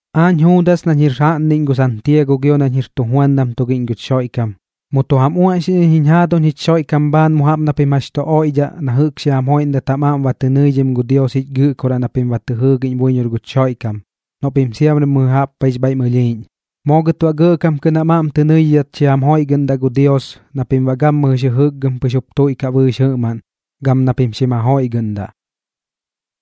Aañ Juudas nañ jir jaꞌnniꞌñ gu Santiago gio nañ jir tujuandam tugiꞌñ guch Xoiꞌkam, mu tu jam uaꞌñxiꞌñ iñ jiñ jaaduñ jich Xoiꞌkam bhaan mu jaꞌp na pim jax tu oiꞌdhaꞌ na jɨꞌk xi jam joiꞌndat jam aꞌm ba tɨ nɨidhim gu Dios jich Gɨꞌkoraꞌ na pim ba tɨ jɨɨgiꞌñ buiñor guch Xoiꞌkam noꞌ pim siamri mɨjɨ jaꞌp paiꞌx bhaiꞌm ɨlhiiꞌñ. Moo gɨt baꞌ gɇꞌkam kɨꞌn jam aꞌm tɨ nɨidhidhat xi jam joiꞌgɨꞌndaꞌ gu Dios na pim baꞌ gammɨjɨx jɨjɨkgɨm pɨx jup tuiꞌkaꞌ bɨɨx jɨꞌmaꞌn, gam na pim xim jajoiꞌgɨꞌndaꞌ.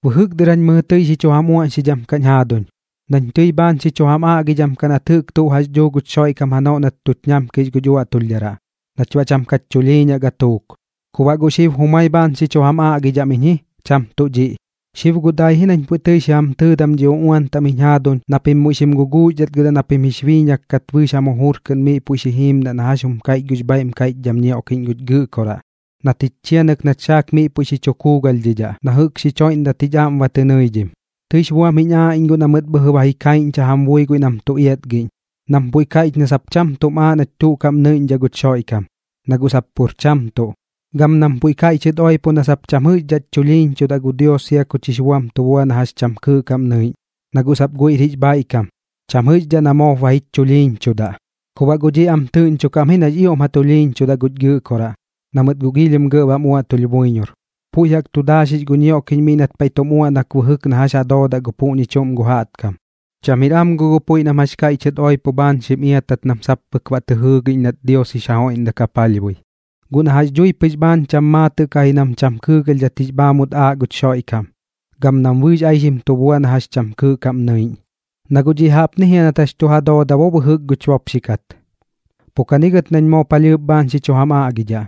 Bɨjɨk dɨr jañ mɨjɨ tɨi xi chu jam uaꞌñxidham kaꞌñ jaaduñ, nañ tɨi bhaan xi chu jam aꞌgidham kaꞌ nat jɨꞌk tuꞌ jax dhuu guch Xoiꞌkam janoꞌ nat tuch ñamkix guch uaꞌtulhdharaꞌ nach baꞌ cham kach chulhiiñaꞌ gatuuk. Ku baꞌ guꞌ xib jumai bhaan xi chu jam aꞌgidham iñ ji, cham tuꞌ dhiꞌ. Xib guꞌ dai ji nañ puiꞌ tɨi xi jam tɨɨdam dhi uꞌuan taꞌm jiñ jaaduñ na pim muiꞌ xim guguuxdhatgɨdaꞌ na pim jix biiñak kat bɨɨx jam jujur kɨꞌn miꞌ puiꞌ xi jiimdaꞌ na jax jum kaiꞌch gux bhaiꞌm kaiꞌchdham ñioꞌkiꞌñ guch Gɨꞌkoraꞌ, nat jich chianɨk nach saak miꞌ puiꞌ tu kuugalhdhidhaꞌ na jɨꞌk xich joiꞌndat jich aꞌm ba tɨ nɨidhim. Tɨix buam jiñ aaꞌ iñ guꞌ na mɨt bhɨjɨ ba ji kaiꞌñcha jam bui guiꞌ nam tu iatgiꞌñ, nam puiꞌ kaiꞌch na sap cham tum aaꞌ nach tuꞌ kaꞌm nɨiꞌñdhaꞌ guch Xoiꞌkam, na guꞌ sap pur cham tuꞌ. Gam nam puiꞌ kaiꞌchɨt oipo na sap cham jɨꞌxdhaꞌch chulhiiñchudaꞌ gu Dios sia kuch jix buam tu bua na jax cham kɨɨꞌ kaꞌm nɨiꞌñ, na guꞌ sap guiꞌr jix bhaiꞌkam, cham jɨꞌxdhaꞌ na moop ba jich chulhiiñchudaꞌ. Ku baꞌ guꞌ dhiꞌ am tɨꞌñchokaꞌ am ji nax ioꞌm ja tulhiiñchudaꞌ guch Gɨꞌkoraꞌ, na mɨt guꞌ giilhim gɇꞌ bam uaꞌtulh buiñor. Puiꞌ jaꞌk tu daaxix gu ñioꞌkiꞌñ miꞌ nat paiꞌ tum uaꞌnak bɨjɨk na jax ja doodaꞌ gu puꞌñi chuꞌm gu jaꞌtkam. Cham jir am guꞌ gu puiꞌ nam jax kaiꞌchɨt oipo bhaan xim iatat nam sap pɨk baꞌ tɨ jɨɨgiꞌñ nat gu Dios jix ja joiꞌndak ja palhbui, guꞌ na jax dhui pɨx bhaan cham maatɨꞌ kaꞌ ji nam cham kɨɨgalhdhat jix bhaamut aaꞌ guch Xoiꞌkam, gam nam bɨɨx aixim tu bua na jax cham kɨɨꞌ kaꞌm nɨiꞌñ. Na guꞌ dhiꞌ jaꞌpni jia nat jax tu ja dooda bo bɨjɨk guch bopxi kat. Pu kani gɨt nañ moo palhɨɨp bhaan xi chu jam aꞌgidhaꞌ.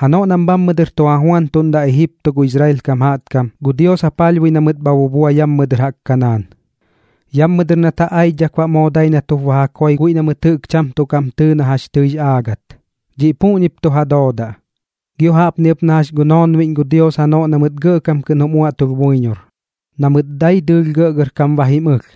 Janoꞌ nam bhammɨ dɨr tu ja juantuꞌndaꞌ Ejipto gu Israel kam jaꞌtkam, gu Dios ja palhbui na mɨt baꞌ bha bubua yammɨ dɨr jaꞌk Kanaan. Yammɨ dɨr nat ja aichdhak baꞌ moo dai nat jup ba ja koi guiꞌ na mɨt jɨꞌk cham tuꞌ kaꞌm tɨɨ na jax tɨix aagat. Dhiꞌ puꞌñip tu ja doodaꞌ. Gio jaꞌpni ɨp na jax gu noonbiꞌñ gu Dios janoꞌ na mɨt gɇꞌkam kɨꞌn jum uaꞌtulh buiñor, na mɨt dai dɨɨlh gɇꞌgɇrkam ba jim ɨlh,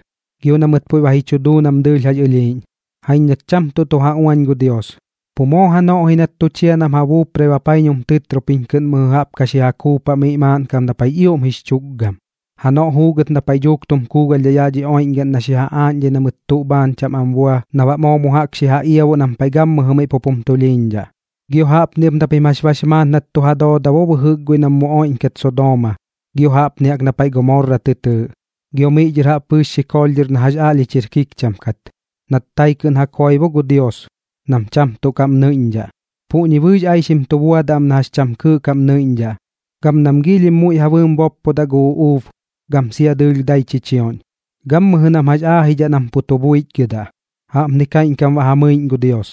gio na mɨt puiꞌ ba ji chu duu nam dɨɨlh jax ɨlhiiꞌñ. Jaiñ nat cham tuꞌ tu ja uañ gu Dios, pu moo janoꞌ ji nat tu chia nam ja buuprai bapaiñum tɨtropiñ kɨꞌn mɨjɨ jaꞌp ka xi ja kuupaꞌ miꞌ maaꞌn kap na paiꞌx ioꞌm jix chu tukgam, janoꞌ juugɨt na paiꞌ dhuuk tum kuugalhdhaꞌ yaꞌ dhi oiꞌñgaꞌn na xi ja aaꞌñdhai na mɨt tuꞌ bhaan cham am bua na baꞌ moo mu jaꞌk xi ja iabuꞌ nam paiꞌ gammɨjɨ miꞌ pup jum tulhiiñdhaꞌ. Gio jaꞌpni ɨp na pim jax bax maat nat tu ja dooda bɨjɨk guiꞌ nam mu oiꞌñkat Sodooma, gio jaꞌpni jaꞌk na paiꞌ Gomorra tɨ tɨɨꞌ, gio miꞌ dhɨr jaꞌp bɨɨx xikoolh na jax aꞌlhich jir kikcham kat, nat tai kɨꞌn ja koi bo gu Dios nam cham tuꞌ kaꞌm nɨiꞌñdhaꞌ. Puꞌñi bɨɨx aixim tu buadaꞌ am na jax cham kɨɨꞌ kaꞌm nɨiꞌñdhaꞌ, gam nam giilhim muiꞌ ja bɨɨm boppodaꞌ gu uꞌuub, gam sia dɨɨlh dai chichioꞌñ. Gammɨjɨ nam jax aajidhaꞌ nam pu tu buichgɨdaꞌ, jaꞌpni kaiꞌñkam baꞌ ja mɨiꞌñ gu Dios,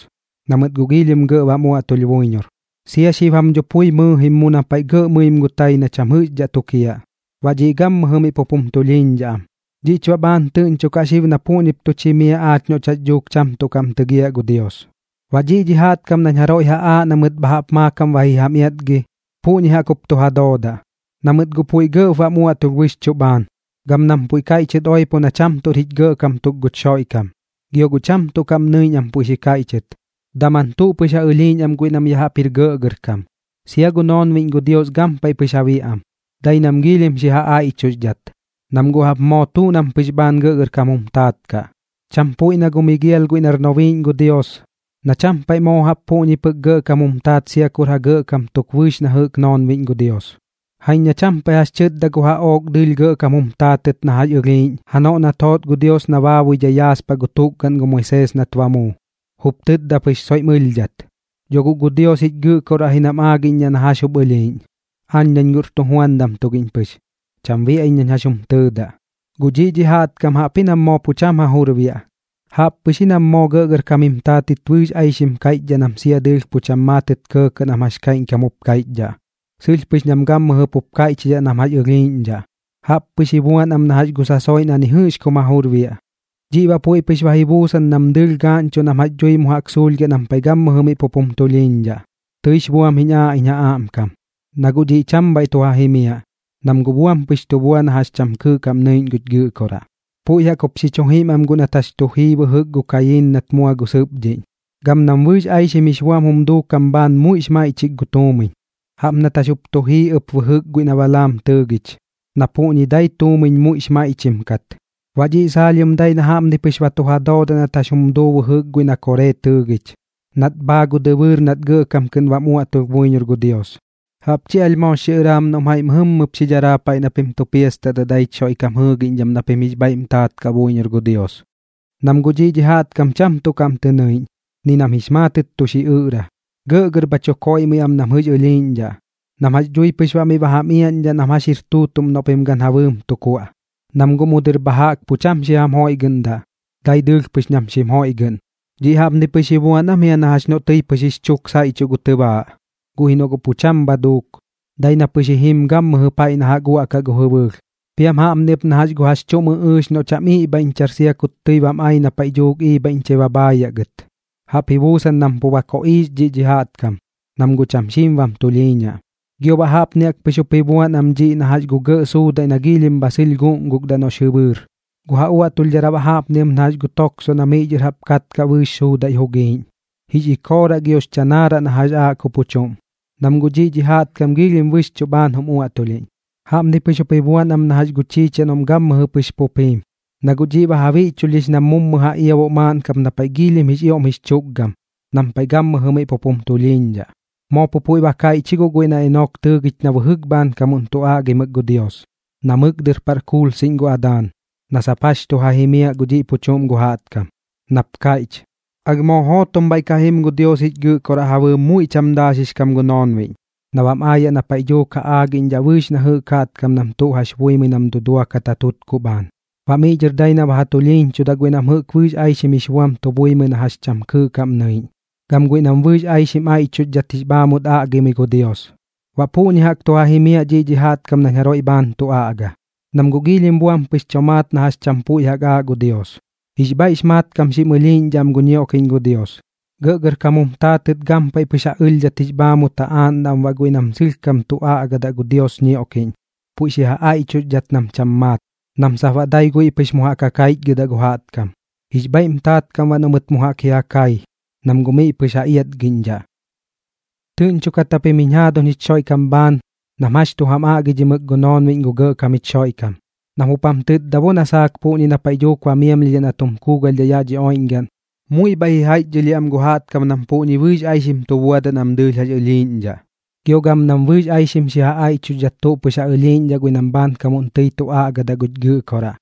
na mɨt guꞌ giilhim gɇꞌ bam uaꞌtulh buiñor. Sia xib jam dho pui mɨɨjim mu na paiꞌ gɇꞌ mɨim gu tai na cham jɨꞌxdhaꞌ tukiaꞌ, baꞌ dhiꞌ gammɨjɨ miꞌ pup jum tulhiiñdhaꞌ am. Dhiꞌch baꞌ bhaan tɨꞌñchokaꞌ xib na puꞌñip tuch jimiaꞌ aach noꞌch jax dhuuk cham tuꞌ kaꞌm tɨgiaꞌ gu Dios. Baꞌ dhiꞌ dhi jaꞌtkam nañ jaroiꞌ ja aaꞌ na mɨt bha jaꞌp maakam ba ji jam iatgi, puꞌñi jaꞌk jup tu ja doodaꞌ, na mɨt guꞌ puiꞌ gɇꞌp bam uaꞌtulh bɨxchuꞌ bhaan, gam nam puiꞌ kaiꞌchɨt oipo na cham tuꞌr jich Gɇꞌkam tuk guch Xoiꞌkam. Gio guꞌ cham tuꞌ kaꞌm nɨiꞌñ am puiꞌ xi kaiꞌchɨt, daman tuꞌ pɨx ja ɨlhiiꞌñ am guiꞌ nam ya jaꞌp jir gɇꞌgɇrkam. Sia gu noonbiꞌñ gu Dios gampaiꞌ pɨx ja biaꞌ am, dai nam giilhim xi ja aiꞌchuxdhat, nam guꞌ jaꞌp moo tuꞌ nam pɨx bhaan gɇꞌgɇrkam jum taat kaꞌ. Cham puiꞌ na gu Migial guiꞌ nar nobiiꞌñ gu Dios, na cham paiꞌ moo jaꞌp puꞌñi pɨk gɇꞌkam jum taat sia kur ja gɇꞌkam tuk bɨɨx na jɨꞌk noonbiꞌñ gu Dios. Jaiñ na cham paiꞌ jax xi chɨtda gu jaꞌook dɨɨlh gɇꞌkam jum taatɨt na jax ɨlhiiꞌñ janoꞌ nat joot gu Dios na baabuidhai yaaspaꞌ gu tukgaꞌn gu Moisees nat ba muu. Jup tɨtda pɨx soiꞌm ɨlhdhat: “Dho guꞌ gu Dios jich Gɨꞌkoraꞌ ji nam aagiꞌñdhaꞌ na jax jup ɨlhiiꞌñ. Aañ nañ guꞌr tujuandam tugiꞌñ pɨx, cham biaꞌ iñ nañ jax jum tɨɨdaꞌ.” Guꞌ dhiꞌ dhi jaꞌtkam jaꞌpji nam moo pu cham ja jur biaꞌ, jaꞌp pɨx ji nam moo gɇꞌgɇrkam jim taatɨt bɨɨx aixim kaiꞌchdhaꞌ nam sia dɨɨlh pu cham maatɨt kɇɇ nam jax kaiꞌñkam jup kaiꞌchdhaꞌ. Sɨlh pɨx nam gammɨjɨ pup kaiꞌchidhaꞌ nam jax ɨlhiiꞌñdhaꞌ, jaꞌp pɨx ji buan am na jax gu sasoiꞌ na ni jɨꞌx kum ja jur biaꞌ. Dhiꞌ baꞌ puiꞌ pɨx ba ji buusan nam dɨɨlh gaaꞌñchuꞌ nam jax dhui mu jaꞌk suulhgiaꞌ nam paiꞌ gammɨjɨ miꞌ pup jum tulhiiñdhaꞌ. Tɨix buam jiñ aaꞌ iñ ja aꞌmkam, na guꞌ dhiꞌ cham bhaiꞌ tu ja jimiaꞌ, nam guꞌ buam pɨx tu bua na jax cham kɨɨꞌ kaꞌm nɨiꞌñ guch Gɨꞌkoraꞌ. Puiꞌ jaꞌk jup xi chu jim am guꞌ nat jax tu jii bɨjɨk gu Kayiin nat mua gu sɨpdhiꞌñ. Gam nam bɨɨx aixim jix buam jum duukam bhaan muiꞌx maiꞌchik gu tuumiñ, jaꞌp nat jax tu jii ɨp bɨjɨk guiꞌ na Balaam jup tɨɨgich, na puꞌñi dai tuumiñ muiꞌx maiꞌchim kat. Baꞌ dhiꞌ saalhiom dai na jaꞌpni pɨx ba tu ja doodaꞌ nat jax jum duu bɨjɨk guiꞌ na Koree tɨɨgich, nat bhaa gu dɨbɨɨr nat gɇꞌkam kɨꞌn bam uaꞌtulh buiñor gu Dios. Jaꞌp chi alh moox xiꞌɨraam noꞌm jaiꞌ mɨjɨmmɨp xi dharaa paiꞌ na pim tu piastatdaꞌ daich Xoiꞌkam jɨɨgiꞌñdham na pim jix bhaiꞌm taat kaꞌ buiñor gu Dios. Nam guꞌ dhiꞌ dhi jaꞌtkam cham tuꞌ kaꞌm tɨ nɨiꞌñ, ni nam jix maatɨt tu xiꞌɨꞌra, gɇꞌgɇr bha chu koiꞌmɨi am nam jɨꞌx ɨlhiiꞌñdhaꞌ, nam jax dhui pɨx baꞌ miꞌ ba jam iaꞌñdhaꞌ nam jax jir tuutuꞌm noꞌ pim gan ja bɨɨm tu kuaꞌ. Nam guꞌ mu dɨr bha jaꞌk pu cham xi jam joiꞌgɨꞌndaꞌ, dai dɨɨlh pɨx nam xim joiꞌgɨꞌn. Dhiꞌ jaꞌpni pɨx ji buan am jia na jax noꞌ tɨi pɨx jix chuk saiꞌchuꞌ gu tɨbaaꞌ, guꞌ ji noꞌ guꞌ cham bha duuk, dai na pɨx ji jim gammɨjɨ paiꞌ na jaꞌk uaꞌkaꞌ gu jɨbɨɨlh. Piam jaꞌpni ɨp na jax gu jax chuꞌm ɨꞌɨɨx noꞌ cham iꞌbhaiꞌñchar sia kut tɨi bam ai na paiꞌ dhuuk iibhaiꞌñchai ba bhaayaꞌ gɨt. Jaꞌp ji buusan nam pu ba koꞌiix dhiꞌ dhi jaꞌtkam, nam guꞌ cham xiim bam tulhiiñaꞌ. Gio baꞌ jaꞌpni jaꞌk pɨx jup ji buan am dhiꞌ na jax gu gɇꞌ suudaiꞌ na giilhim bha sɨlh guꞌngukdaꞌ noꞌx jɨbɨɨr. Gu ja uaꞌtulhdharaꞌ baꞌ jaꞌpni ɨp na jax gu toksoꞌ na miꞌ dhɨr jaꞌp katkaꞌ bɨɨx suudaiꞌ jugiiꞌñ, jix ikooraꞌ giox chanaaraꞌ na jax aaꞌ gu pu chuꞌm, nam guꞌ dhiꞌ dhi jaꞌtkam giilhim bɨxchuꞌ bhaan jum uaꞌtulhiꞌñ. Jaꞌpni pɨx jup ba ji buan am na jax gu chiichiaꞌ noꞌm gammɨjɨ pɨx pup jiim, na guꞌ dhiꞌ ba ja biꞌchulhdhix nam mummu ja iabuꞌ maaꞌn kap na paiꞌ giilhim jix ioꞌm jix chukgam, nam paiꞌ gammɨjɨ miꞌ pup jum tulhiiñdhaꞌ. Moo pu puiꞌ ba kaiꞌch ji guꞌ guiꞌ na Enok tɨɨgich na bɨjɨk bhaankamuꞌn tu aꞌgimɨk gu Dios, na mɨk dɨr paꞌr kuulsiꞌñ gu Adaan, na sap jax tu ja jimiaꞌ gu dhiꞌ pu chuꞌm gu jaꞌtkam, nap kaiꞌch: “Alh moo jootom bhaiꞌ ka jim gu Dios jich Gɨꞌkoraꞌ ja bɨɨm muiꞌ cham daaxix kam gu noonbiꞌñ na bam aayaꞌ na paiꞌ dhuuk ja aagiꞌñdhaꞌ bɨɨx na jɨꞌk jaꞌtkam nam tu jax buimɨi nam duduakat gu ja tutkuꞌ bhaan. Baꞌ miꞌ dhɨr dai na ba ja tulhiiñchudaꞌ guiꞌ nam jɨꞌk bɨɨx aixim jix buam tu buimɨi na jax cham kɨɨꞌ kaꞌm nɨiꞌñ, gam guiꞌ nam bɨɨx aixim aiꞌchuxdhat jix bhaamut aꞌgimɨi gu Dios.” Baꞌ puꞌñi jaꞌk tu ja jimiaꞌ dhiꞌ dhi jaꞌtkam nañ jaroiꞌ bhaan tu aꞌga, nam guꞌ giilhim buam pɨx tomaat na jax cham puiꞌ jaꞌk aaꞌ gu Dios. Jix bhaiꞌx mat kam xim ɨlhiiꞌñdhaꞌ am gu ñioꞌkiꞌñ gu Dios, gɇꞌgɇrkam jum taatɨt gampaiꞌ pɨx ja ɨlhdhat jix bhaamut ja aaꞌndaꞌ am baꞌ guiꞌ nam sɨlhkam tu aꞌgadaꞌ gu Dios ñioꞌkiꞌñ puiꞌ xi ja aiꞌchuxdhat nam cham tuꞌ maat, nam sap baꞌ dai guiꞌ pɨx mu jaꞌk ja kaichgɨdaꞌ gu jaꞌtkam. Jix bhaiꞌm taat kaꞌ am baꞌ noꞌ mɨt mu jaꞌk ji ja kai, nam guꞌ miꞌ pɨx ja iatgiꞌñdhaꞌ. Tɨꞌñchokat japim jiñ jaaduñ jich Xoiꞌkam bhaan nam jax tu jam aꞌgidhimɨk gu noonbiꞌñ gu Gɇꞌkam jich Xoiꞌkam, nam jup jam tɨtda bo na saak puꞌñi na paiꞌ dhuuk ba miamlhiaꞌ na tum kuugalhdhaꞌ yaꞌ dhi oiꞌñgaꞌn, muiꞌ bhaiꞌ ji jaiꞌchdhɨlhiaꞌ am gu jaꞌtkam nam puꞌñi bɨɨx aixim tu buadaꞌ nam dɨɨlh jax ɨlhiiꞌñdhaꞌ, gio gam nam bɨɨx aixim xi ja aiꞌchuxdhat tuꞌ pɨx ja ɨlhiiꞌñdhaꞌ guiꞌ nam bhaankamuꞌn tɨi tu aꞌgadaꞌ guch Gɨꞌkoraꞌ.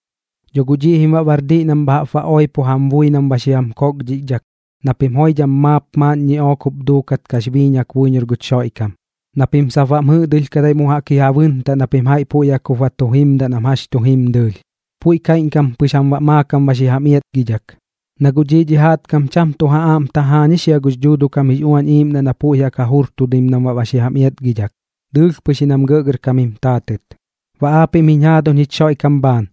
Dho guꞌ dhiꞌ jim baꞌ bar diꞌ nam bha jaꞌp ba oipo jam bui nam ba xi jam kokdhichdhak na pim joidham maap maaꞌn ñiꞌook jup duukat kax biiñak buiñor guch Xoiꞌkam, na pim sap baꞌm jɨꞌdɨlhkadai mu jaꞌk ji ja bɨntaꞌ na pim jaiꞌ puiꞌ jaꞌk jup ba tu jimdaꞌ nam jax tu jim dɨɨlh. Puiꞌ kaiꞌñkam pɨx jam baꞌ maakam ba xi jam iatgidhak, na guꞌ dhiꞌ dhi jaꞌtkam cham tuꞌ ja aꞌm tajaañix jia gux Dhuuduꞌ kam jix Uañ Iiꞌmdaꞌ na puiꞌ jaꞌk ja jurtudim nam baꞌ xi jam iatgidhak, dɨɨlh pɨx ji nam gɇꞌgɇrkam jim taatɨt. Baꞌ aapiꞌm jiñ jaaduñ jich Xoiꞌkam bhaan,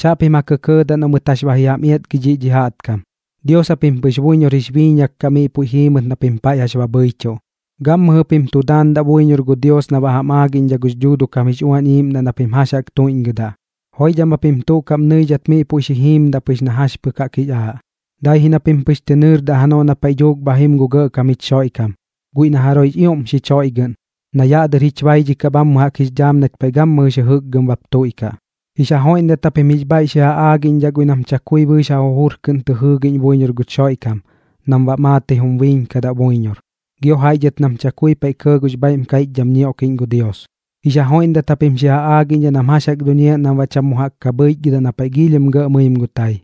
chaꞌpim ja kɇkɇɇdaꞌ noꞌ mɨt jax ba ji jam iatgi dhiꞌ dhi jaꞌtkam. Dios japim pɨx buiñor jix biiñak kaꞌ miꞌ puiꞌ jiimɨt na pim paiꞌ jax ba bhɨichuꞌ. Gammɨjɨ pim tu daandaꞌ buiñor gu Dios na baꞌ jam aagiꞌñdhaꞌ gux Dhuuduꞌ kam jix Uañ Iiꞌmdaꞌ na pim jax jaꞌk tuiꞌñgɨdaꞌ. Joidham japim tuꞌ kaꞌm nɨidhat miꞌ puiꞌ xi jiimdaꞌ pɨx na jax pɨk jaꞌk jix aaꞌ, dai ji na pim pɨx tɨ nɨɨrdaꞌ janoꞌ na paiꞌ dhuuk bha jim gu Gɇꞌkam jich Xoiꞌkam, guiꞌ na jaroiꞌx ioꞌm xich joiꞌgɨꞌn, na yaꞌ dɨr jich baidhikaꞌ bhammɨ jaꞌk jix dhaam nach paiꞌ gammɨjɨx jɨjɨkgɨm bap tuiꞌkaꞌ. Jix ja joiꞌndat japim jix bhaiꞌp xi ja aagiꞌñdhaꞌ guiꞌ nam chakui bɨɨx ja jujur kɨꞌn tɨ jɨɨgiꞌñ buiñor guch Xoiꞌkam nam baꞌ maatɨi jum biiñkadaꞌ buiñor. Gio jaiꞌ dhɨt nam chakui paiꞌ kɇɇ gux bhaiꞌm kaiꞌchdham ñioꞌkiꞌñ gu Dios, jix ja joiꞌndat japim xi ja aagiꞌñdhaꞌ nam jax jaꞌk duñiaꞌ nam baꞌ cham mu jaꞌk ka bhɨichgɨdaꞌ na paiꞌ giilhim gɇꞌ mɨim gu tai,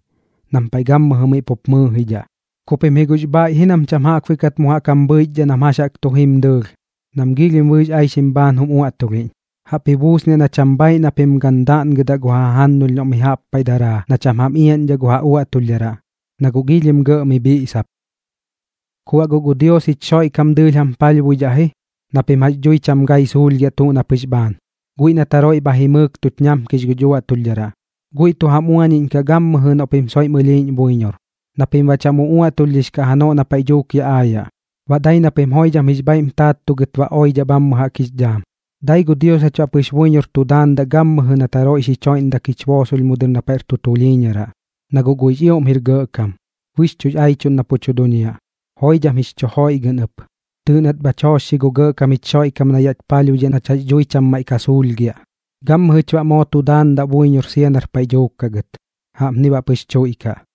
nam paiꞌ gammɨjɨ miꞌ pup mɨɨjidhaꞌ. Ku pim ji guꞌx bhaiꞌ ji nam cham jaꞌkbuiꞌ kat mu jaꞌk jam bhɨichdhaꞌ nam jax jaꞌk tu jim dɨɨlh nam giilhim bɨɨx aixim bhaan jum uaꞌtulhiꞌñ. Jaꞌp ji buusniaꞌ na cham bhaaiꞌ na pim gan daꞌngɨdaꞌ gu ja jajannulh noꞌ mi jaꞌp paiꞌ daraa na cham jam iaꞌñdhaꞌ gu ja uaꞌtulhdharaꞌ, na guꞌ giilhim gɇꞌ mi bhiꞌsap. Ku baꞌ guꞌ gu Dios jich Xoiꞌkam dɨɨlh jam palhbuidhaꞌ ji na pim jax dhui cham gai suulhgiaꞌ tuꞌ na pɨx bhaan, guiꞌ nat jaroiꞌ bha jimɨɨk tuch ñamkix guch uaꞌtulhdharaꞌ. Guiꞌ tu jam uañiꞌñkaꞌ gammɨjɨ noꞌ pim soiꞌm ɨlhiiꞌñ buiñor, na pim baꞌ cham uꞌuaꞌtulhdhix kaꞌ janoꞌ na paiꞌ dhuuk yaꞌ aayaꞌ, baꞌ dai na pim joidham jix bhaiꞌm taattugɨt ba oidhaꞌ bhammɨ jaꞌk jix dhaam. Dai gu Dios jach baꞌ pɨx buiñor tu daandaꞌ gammɨjɨ nat jaroiꞌ xich joiꞌndak jich boosolh mu dɨr na paiꞌr tu tulhiiñaraꞌ, na guꞌ guiꞌx ioꞌm jir gɇꞌkam, bɨxchuꞌx aichuꞌn na pu tu duñiaꞌ. Joidham jix chu joiꞌgɨꞌn ɨp, tɨɨꞌ nat bhach joochxi gu Gɇꞌkam jich Xoiꞌkam na yaꞌch palhbuidhaꞌ nach jax dhui cham maiꞌ ka suulhgiaꞌ. Gammɨjɨch baꞌ moo tu daandaꞌ buiñor sia nar paiꞌ dhuuk kaꞌ gɨt. Jaꞌpni baꞌ pɨx tuiꞌkaꞌ.